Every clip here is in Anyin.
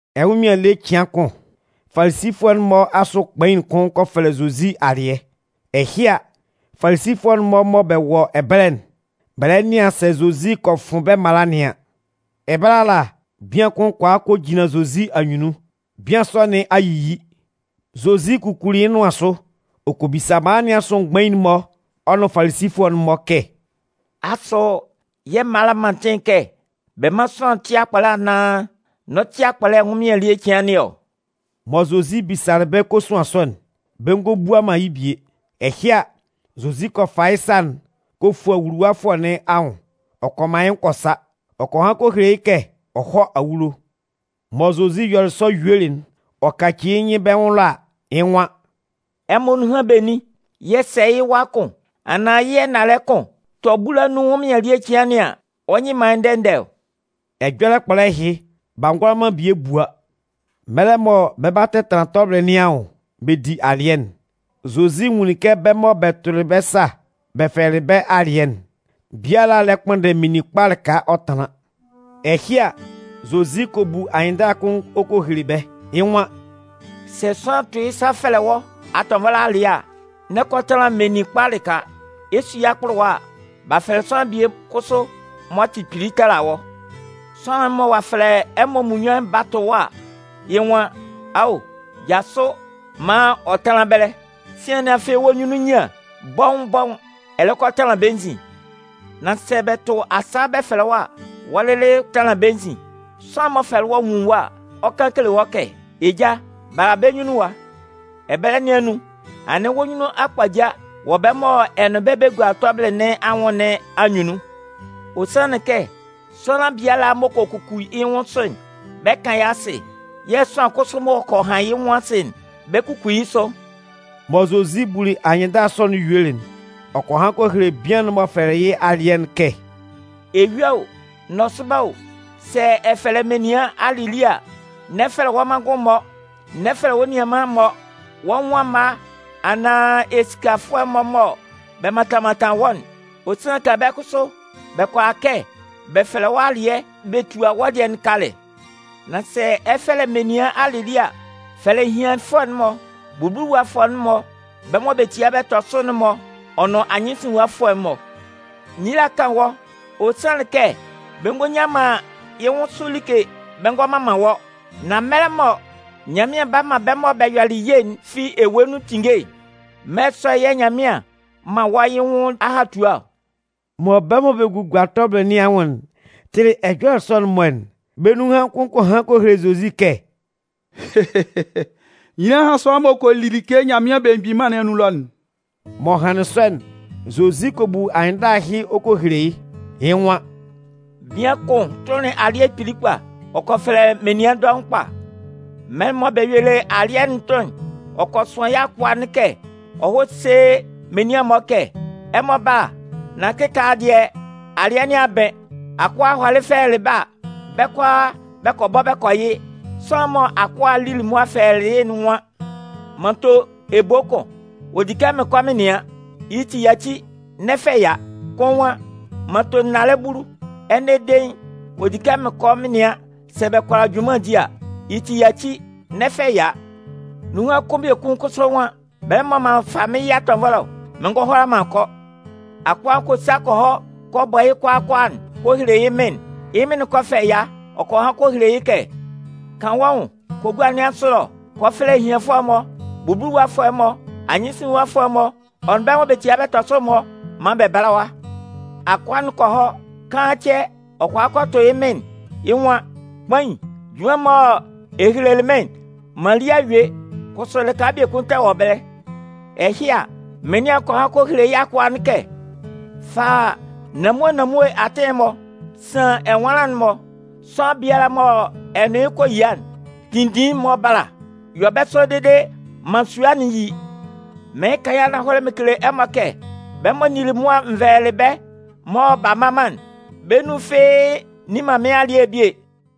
Ɛnwʋnmɩan ele cɩan kʋn, Falisifʋɛ'n-mɔ asʋ kpain kʋn kɔ fɛlɛ Zozi alɩɛ. Ɛhɩ a, Falisifʋɛ'n-mɔ mɔ bɛ wɔ ɛbɛlɛ'n, bɛ lɛ nɩan sɛ Zozi kɔ fʋn bɛ́ mala nɩn an. Ɛbɛlɛ ala, bian kʋn kɔ a kɔ jinlan Zozi anyunnun. Bian sɔ nɩn a yiyi. Zozi kukuli yɩ́ nʋan sʋ, ɔ kɔ bisa mala nɩn asʋ mgbain'n-mɔ ɔ nʋn Falisifʋɛ'n-mɔ kɛ: “Asʋ yɛ̂ mala'n man atɩn kɛ bɛ mán sʋanlan tɩ́ akpɔlɛ anaan n'ɔ tɩ akpɔlɛ ɛnwʋnmɩan ele cɩan nɩn anun ɔ?” Mɔ Zozi bisalɩ bɛ́ kosuan sɔ'n, bɛ ngɔ bua yɩ́ bie. Ɛhɩ a, Zozi kɔ fa yɩ́ sa'n kɔ fua wuluwafʋɛ nɩn anwʋn ɔ kɔ man yɩ́ nwʋn kɔ sa. Ɔ kɔ han kɔ hele yɩ́ kɛ ɔ hɔ́ awulo. Mɔ Zozi yɔlɩ sɔ yuelɩ'n, ɔ kacili yɩ́ nyɩn bɛ́ nwʋn ɛlɔ a, yɩ́ nwan: “Ɛmɔ nunhan benin yɛ̂ sɛ yɩ́ wa kʋn anaan yɩ́ ɛnalɛ kʋn tɔ bula nun ɛnwʋnmɩan ele cɩan nɩn an, ɔ nyɩ man yɩ́ ndɛ ndɛ ɔ?” Ɛjɔlɛ kpɔlɛ ɛhɩ, b'a ngʋala man bie bua. Mɛlɛ mɔ bɛ 'ba tɛtanlan tɔbɩlɩ nɩn anwʋn bɛ di alɩɛ'n, Zozi nwunlin kɛ bɛ́ mɔ bɛ tʋlɩ bɛ́ sa bɛ fɛlɛlɩ bɛ́ alɩɛ'n, biala lɛ kpʋnndɛ meninkpa lɩka ɔ tanlan. Ɛhɩ a, Zozi kɔ bu anyɩnndala kʋn ɔ kɔ hele bɛ́. Yɩ́ nwan: “Sɛ sʋanlan tʋ yɩ́ sa fɛlɛ wɔ́ atɔnvɔlɛ alɩɛ a, n'ɛ kɔ tanlan meninkpa lɩka. Ɛ 'su yɩ́ akpʋlʋwa a, b'a fɛlɛ sʋanlan bie kʋsʋ m'ɔ tɩ kpili tala wɔ́. Sʋanlan'n mɔ ɔ'a fɛlɛ ɛmɔ munnyuan'n ba tʋ wɔ́ a, yɩ́ nwan: ‘Ao, jasʋ maan ɔ tánlan ɛbɛlɛ.’ Sian anɩn afɩ wɔ́ nyunnun nyian, bɔʋn-bɔʋn, ɛ lɛ kɔ a tanlan bɛ́ nzin. Nan sɛ bɛ tʋ bɛ́ sa bɛ fɛlɛ wɔ́ a, wɔ́ lɩlɩ tanlan bɛ́ nzin. Sʋanlan'n m'ɔ fɛlɛlɩ wɔ́'n nwun wɔ́ a, ɔ 'kan kele wɔ́ kɛ: ‘Eja, bala bɛ́ nyunnun ɛwa.’ Ɛbɛlɛ nɩn anun, anɩn wɔ́ nyunnun a kpaja wɔ́ bɛ́ mɔ ɛ nʋn bɛ́ bɛ gua tɔbɩlɩ nɩn anwʋn nɩn anyunnun. Ɔ sanlɩn kɛ sʋanlan biala m'ɔ kɔ kuku yɩ́ nwʋn sʋ'n, bɛ 'kan yɩ́ asɩ. Sʋanlan kʋsʋ m'ɔ kɔ han yɩ́ nwʋn asɩ'n, bɛ 'kuku yɩ́ sʋ.” Mɔ Zozi buli anyɩnndala sɔ'n yuelɩ'n, ɔ kɔ han kɔ hele bian'n m'ɔ fɛlɛlɩ yɩ́ alɩɛ'n kɛ: “Eyua o, nɔsʋba o, sɛ ɛ 'fɛlɛ menian alɩlie a, n'ɛ fɛlɛ wɔ́ manngʋn-mɔ, wɔ́ nianman-mɔ, wɔ́ nwʋn amma-mɔ anaan esikafʋɛ-mɔ mɔ bɛ mantan mantan wɔ́'n. Ɔ sanlɩn kɛ bɛ́ kʋsʋ bɛ kʋala kɛ bɛ fɛlɛ wɔ́ alɩɛ bɛ tua wɔ́ dɩɛ'n kalɛ. Nan sɛ ɛ 'fɛlɛ menian alɩlie a, fɛlɛ ehianfʋɛ'n-mɔ, bubuluwafʋɛ'n-mɔ, bɛ́ mɔ bɛ tia bɛ tɔ sʋ'n-mɔ ɔ nʋn anyɩnsinlinwafʋɛ'n-mɔ. Nyila 'kan wɔ́. Ɔ sanlɩn kɛ bɛ ngɔ nyan man yɩ́ nwʋn sʋ like bɛ ngɔ mman man wɔ́. Nan mɛlɛ mɔ Nyanmɩan 'ba man bɛ́ mɔ bɛ yɔlɩ ye'n fi ewue nun tinnge'n, mɛlɛ sɔ'n yɛ̂ Nyanmɩan 'man wɔ́ yɩ́ nwʋn ahatua ɔ.” Mɔ bɛ́ mɔ bɛ gugua tɔbɩlɩ nɩn anwʋn'n tɩlɩ ɛjɔlɛ sɔ'n-mɔ'n, bɛ́ nunhan kʋn kɔ han kɔ hele Zozi kɛ: “Nyila hán sʋanlan m'ɔ kɔ li like Nyanmɩan Belemgbin Mân nɩn anun ɛlɔ'n!” M'ɔ hanlɩn sɔ'n, Zozi kɔ bu anyɩnndala ɛhɩ ɔ kɔ hele yɩ́. Yɩ́ nwan: “Bian kʋn tʋnlɩn alɩɛ kpili kpa. Ɔ kɔ fɛfɛlɛ menian dɔʋn kpa. Mɛlɛ mɔ bɛ yuelɩ alɩɛ'n tʋn'n, ɔ kɔ sʋan yɩ́ akʋa'n kɛ ɔ hɔ́ sé menian'n-mɔ kɛ: ‘Ɛmɔ bála nán kɩkaala dɩɛ, alɩɛ nɩn a bɩn.’ “Akʋa'n hɔlɩ fɛlɛlɩ bɛ́ a, bɛ́ kʋalaa bɛ kɔ bɔ bɛ kɔ yɩ. Sʋanlan'n mɔ akʋa'n lili mʋa fɛlɛlɩ yɩ́'n nwan: ‘M'an to ebo kʋn. Ɔ di kɛ mɩn kɔ mɩn nɩan. Yɩ́ ti, yaci, n'ɛ fɛ ɛya.’ “Kʋn nwan: ‘M'an to nnalɛ bulu. Ɛnɛ dein ɔ di kɛ mɩn kɔ mɩn nɩan sɛ bɛ kʋala junman di a. Yɩ́ ti, yaci, n'ɛ fɛ ɛya.’ “Nunhan kʋn biekun kʋsʋ nwan: ‘Bɛlɛ mɔ m'an fa mɩ́n yɩ atɔnvɔlɛ ɔ. Mɩn ngɔ hʋala man kɔ.’ “Akʋa'n kɔ sa kɔ hɔ kɔ bɔ kʋalaa kʋalaa kɔ hele yɩ́ mɩn'n. Yɩ́ mɩn'n kɔ fɛ ɛya, ɔ kɔ han kɔ hele yɩ́ kɛ: ‘Kan wɔ́ nwʋn kɔ gua nɩn asʋ ɛlɔ kɔ fɛfɛlɛ ehianfʋɛ'n-mɔ, bubuluwafʋɛ'n-mɔ, anyɩnsinlinwafʋɛ'n-mɔ ɔ nʋn bɛ́ mɔ bɛ tia bɛ tɔ sʋ'n-mɔ maan bɛ bála ɛwa.’ “Akʋa'n kɔ hɔ. Kaan cɛ, ɔ kɔ a kɔ tʋ yɩ́ mɩn'n. Yɩ́ nwan: ‘Kpain, junman'n mɔ ɛ helelɩ mɩ́n'n, m'an li a yue, kʋsʋ lɩka biekun tɛ wɔ ɛbɛlɛ.’ “Ɛhɩ a, mɩnlɩan'n kɔ han kɔ hele yɩ́ akʋa'n kɛ: ‘Fa nanmue nanmue atɩn'n-mɔ, san ɛnwanlan'n-mɔ, sʋanlan biala mɔ ɛ nʋn yɩ́ kɔ yia'n, tinndin yɩ́ maan ɔ bála. Yɔ bɛ́ sɔ dede maan sua'n yí. Mɩɩn kan mɩn kele ɛmɔ kɛ: Bɛ́ mɔ n nili mʋa n vɛlɛlɩ bɛ́ mɔ b'a mma man'n, bɛ́ nun fɩ́ɩ́ nni man mɩ́n alɩɛ'n bie!’”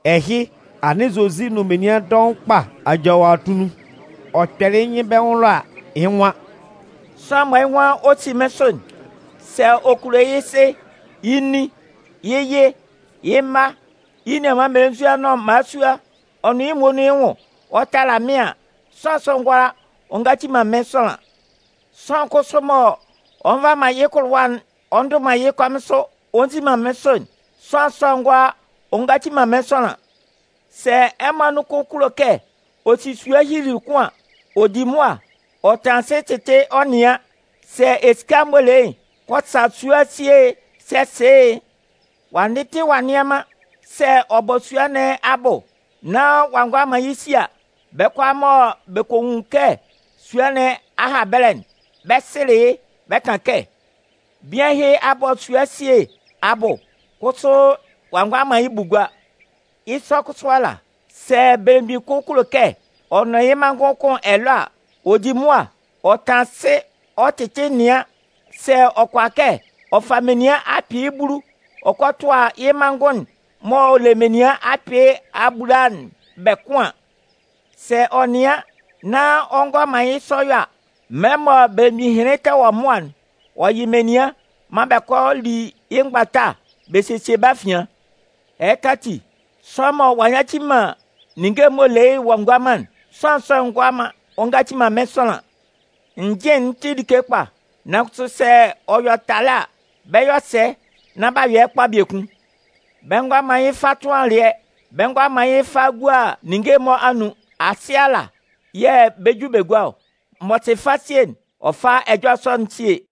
Ɛhɩ, anɩn Zozi nʋn menian dɔʋn kpa aja wɔ atunnun. Ɔ kpɛlɩ yɩ́ nyɩn bɛ́ nwʋn ɛlɔ a, yɩ́ nwan: Sʋanlan mɔ yɩ́ nwan ɔ 'si mɩ́n sʋ'n, sɛ ɔ kulo yɩ́ sɩ, yɩ́ nin, yɩ́ yɩ, yɩ́ mma, yɩ́ nianman mmelenzua nʋn mmalasua ɔ nʋn yɩ́ muonun yɩ́ nwʋn ɔ tala mɩ́n an, sʋanlan sɔ'n ngʋala ɔ ngaci man mɩ́n sʋanlan. Sʋanlan kʋsʋ m'ɔ nva man yɩ́ kʋlʋwa'n ɔ ndʋ man yɩ́ kɔmɩn sʋ ɔ nzi man mɩ́n sʋ'n, sʋanlan sɔ'n ngʋala ɔ ngaci man mɩ́n sʋanlan. “Sɛ ɛmɔ anun kʋn kulo kɛ ɔ si sua hyilili kʋn an, ɔ di mʋa ɔ tanlan asɩ ɔ tɩtɩ ɔ nɩan sɛ esika'n m'ɔ le yɩ́'n kɔ sa sua'n si e sɛ se e. Ɔ'a ndɩtɩ ɔ'a nnɩan man sɛ ɔ bɔ sua nɩn abʋ nan ɔ a ngʋala man yɩ́ si a, bɛ́ kʋalaa mɔ bɛ kɔ nwun kɛ sua nɩn a ha ɛbɛlɛ'n, bɛ 'sɩlɩ yɩ́. Bɛ kan kɛ: ‘Bian ɛhɩ a bɔ sua esie abʋ kʋsʋ ɔ'a ngʋala man yɩ́ bʋ gua!’ “Yɩ́ sɔ kʋsʋ ala, sɛ belemgbin kʋn kulo kɛ ɔ nʋn yɩ́ manngʋn kʋn ɛlɔɛ a, ɔ di mʋa ɔ tanlan asɩ ɔ tɩtɩ nɩan sɛ ɔ kʋala kɛ ɔ fa menian akpɩɩ bulu ɔ kɔ tʋa yɩ́ manngʋn'n m'ɔ le menian akpɩɩ abulaa'n bɛ kʋn an. Sɛ ɔ nɩan nán ɔ ngʋala man yɩ́ sɔ yɔ a, mɛlɛ mɔ belemgbin ɛhɩnlɩn tɛ wɔ mʋa'n, ɔ yɩ menian maan bɛ kɔ li yɩ́ mgbata bɛ sesie bɛ́ afian. Ɛhɩka ati, sʋanlan mɔ ɔ'a nyaci man ninnge'n m'ɔ le yɩ́'n ɔ'a ngua man'n, sʋanlan sɔ'n ngʋala ɔ ngaci man mɩ́n sʋanlan. “Njɩn'n tɩ like kpa. Nan kʋsʋ sɛ ɔ yɔ talɛ a, bɛ 'yɔ sɛ nán ɔ'a yɔ kpa biekun? Bɛ ngʋala man yɩ́ fa tʋn alɩɛ, bɛ ngʋala man yɩ́ fa gua ninnge'n-mɔ anun. Asɩ ala yɛ̂ bɛ ju bɛ gua ɔ. M'ɔ sɩ fasie'n, ɔ fá ɛjɔlɛ sɔ'n ɔ síe!”